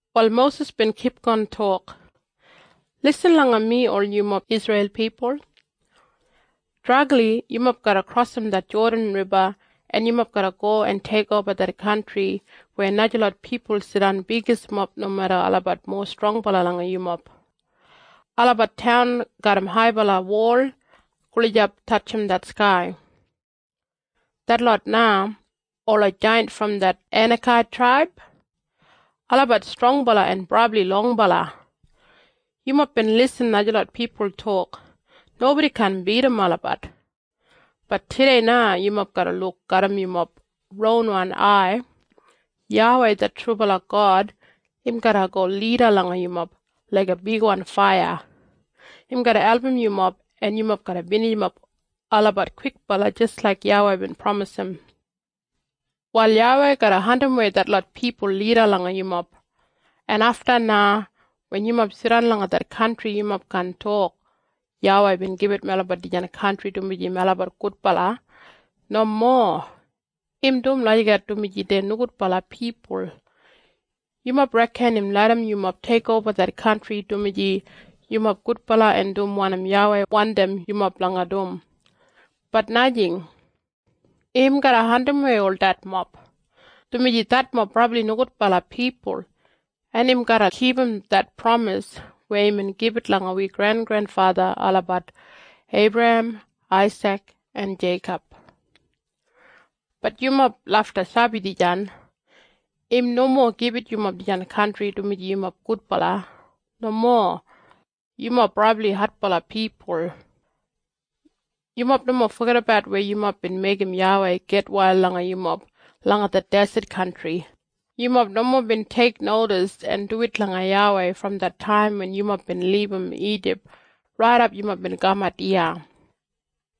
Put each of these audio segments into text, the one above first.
Wal Mosis bin kipgon tok, “Lisin langa mi ol yumob Isreil pipul! Dregli yumob garra krosim det Jodan Riba en yumob garra go en teikoba det kantri weya najalot pipul jidan bigismob nomeda olabat mowa strongbala langa yumob. Olabat taun garram haibala wol gulijap tatjim det skai. Detlot na, ola jaiyant brom det Enakait traib, olabat strongbala en brabli longbala. Yumob bin irrim najalot pipul tok, ‘Nobodi kaan bidim olabat.’ Bat tudei na yumob garra luk garram yumob ronwan ai, YAWEI det trubala God im garra go lida langa yumob laiga bigwan faiya. Im garra album yumob en yumob garra binijimap olabat kwikbala jis laik YAWEI bin pramis. “Wal YAWEI garra andimwei detlot pipul lida langa yumob. En afta na, wen yumob jidan langa det kantri yumob kaan tok, ‘YAWEI bin gibit melabat dijan kantri dumaji melabat gudbala.’ Nomo! Im dum lagijat dumaji dei nogudbala pipul. Yumob reken im larram yumob teikoba det kantri dumaji yumob gudbala en dum wanim YAWEI wandim yumob blanga dum, bat najing! Im garra andimwei ol detmob, dumaji detmob brabli nogudbala pipul en im garra kipum det pramis weya imbin gibit langa wi grengrenfatha olabat Eibrahem, Aisik, en Jeikob. Bat yumob lafta sabi dijan. Im nomo gibit yumob dijan kantri dumaji yumob gudbala. Nomo! Yumob brabli adbala pipul. “Yumob nomo fogedabat weya yumob bin meigim YAWEI gitwail langa yumob langa det deset kantri. Yumob nomo bin teiknodis en duwit langa YAWEI brom det taim wen yumob bin libum Ijip raidap yumob bin kamat iya.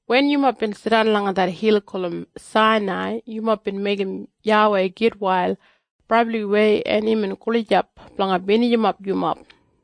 Wen yumob bin jidan langa det hil gulum Sainai yumob bin meigim YAWEI gitwail brabliwei en imbin gulijap blanga binijimap yumob.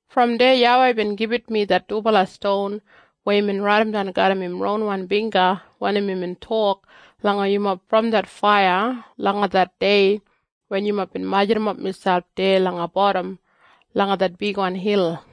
“Brom deya YAWEI bin gibit mi det dubala ston weya imbin raidimdan garram im ronwan bingga wanim imbin tok langa yumob brom det faiya langa det dei wen yumob bin majurrumap miselp deya langa bodam langa det bigwan hil.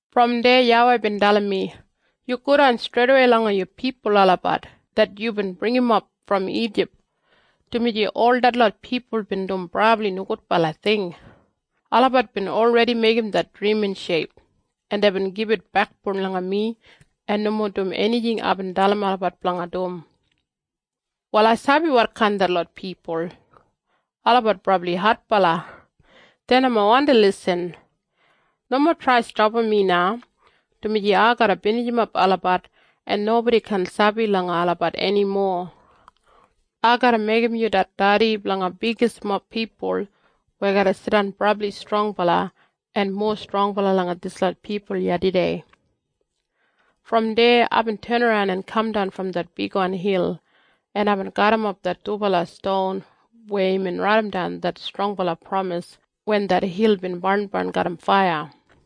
“Brom deya YAWEI bin dalim mi, ‘Yu godan streidawei langa yu pipul olabat det yubin bringimap brom Ijip, dumaji ol detlot pipul bin dum brabli nogudbala ting. Olabat bin olredi meigim det drimin sheip, en deibin gibit bekboun langa mi en nomo dum enijing aibin dalim olabat blanga dum. “‘Wal ai sabi wotkain detlot pipul. Olabat brabli adbala. Dei nomo wandi lisin. Nomo trai stapam mi na, dumaji ai garra binijimap olabat en nobodi kaan sabi langa olabat enimo. Ai garra meigim yu det dedi blanga bigismob pipul weya garra jidan brabli strongbala, en mowa strongbala langa dislot pipul iya tudei.’ “Brom deya aibin tenaran en kamdan brom det bigwan hil en aibin garrimap det dubala ston weya imbin raidimdan det strongbala pramis wen det hil bin barnbarn garram faiya.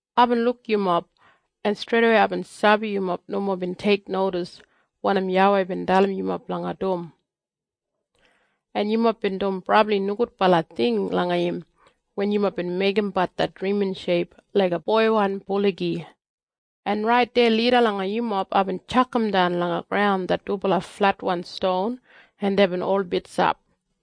Aibin luk yumob, en streidawei aibin sabi yumob nomo bin teiknodis wanim YAWEI bin dalim yumob blanga dum, en yumob bin dum brabli nogudbala ting langa im wen yumob bin meigimbat det drimin sheip laiga boiwan gabigabi. En rait deya lida langa yumob aibin tjakamdan langa graun det dubala fletwan ston en deibin ol bitsap.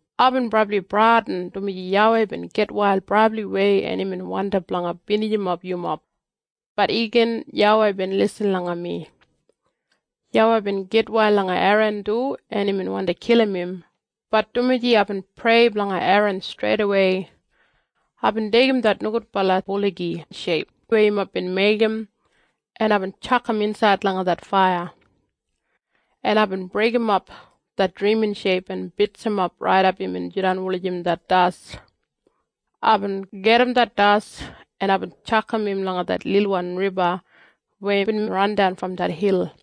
Aibin brabli bradin, dumaji YAWEI bin gitwail brabliwei en imbin wandi blanga binijimap yumob. Bat igin YAWEI bin lisin langa mi. YAWEI bin gitwail langa Eran du en imbin wandi kilim im, bat dumaji aibin prei blanga Eran streidawei. Aibin deigim det nogudbala gabigabi sheip weya yumob bin meigim, en aibin tjakam insaid langa det faiya. En aibin breigimap det drimin sheip en bitsimap raidap imbin jidan wulijim det das. Aibin gajim det das en aibin tjakam im langa det lilwan riba weya bin randan brom det hil.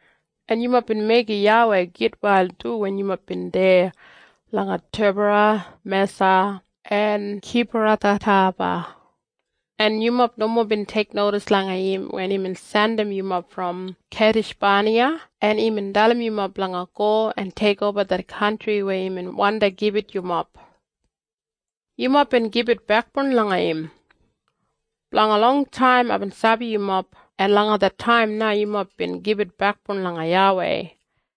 “En yumob bin meigim YAWEI gitwail du wen yumob bin deya langa Tebera, Mesa, en Kibrathataba. En yumob nomo bin teiknodis langa im wen imbin jandim yumob brom Keidishbaniya en imbin dalim yumob blanga go en teikoba det kantri weya imbin wandi gibit yumob. Yumob bin gibit bekboun langa im. Blanga longtaim aibin sabi yumob en langa det taim na yumob bin gibit bekboun langa YAWEI.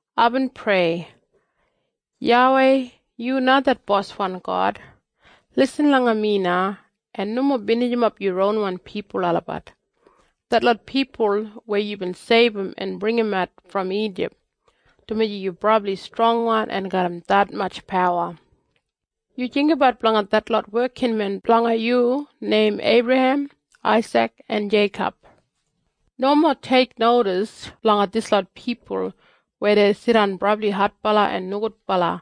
Aibin prei, ‘YAWEI yu na det boswan God. Lisin langa mi na en nomo binijimap yu ronwan pipul olabat, detlot pipul weya yubin seibum en bringimat brom Ijip, dumaji yu brabli strongwan en garram detmatj pawa. Yu jinggabat blanga detlot wekinmen blanga yu neim Eibrahem, Aisik en Jeikob. Nomo teiknodis blanga dislot pipul weya dei jidan brabli adbala en nogudbala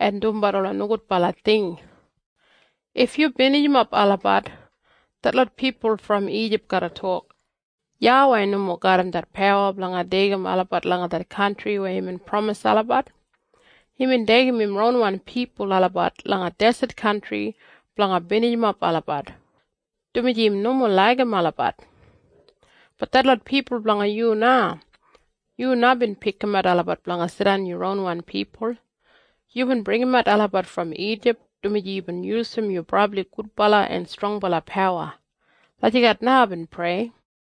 en dumbat ola nogudbala ting. If yu binijimap olabat, detlot pipul brom Ijip garra tok, “YAWEI nomo garram det pawa blanga deigim olabat langa det kantri weya imbin pramis olabat. Imbin deigim im ronwan pipul olabat langa deset kantri blanga binijimap olabat, dumaji im nomo laigim olabat.” Bat detlot pipul blanga yu na. Yu na bin pikimat olabat blanga jidan yu ronwan pipul. Yubin bringimat olabat brom Ijip dumaji yubin yusum yu brabli gudbala en strongbala pawa.’ Lagijat na aibin prei.”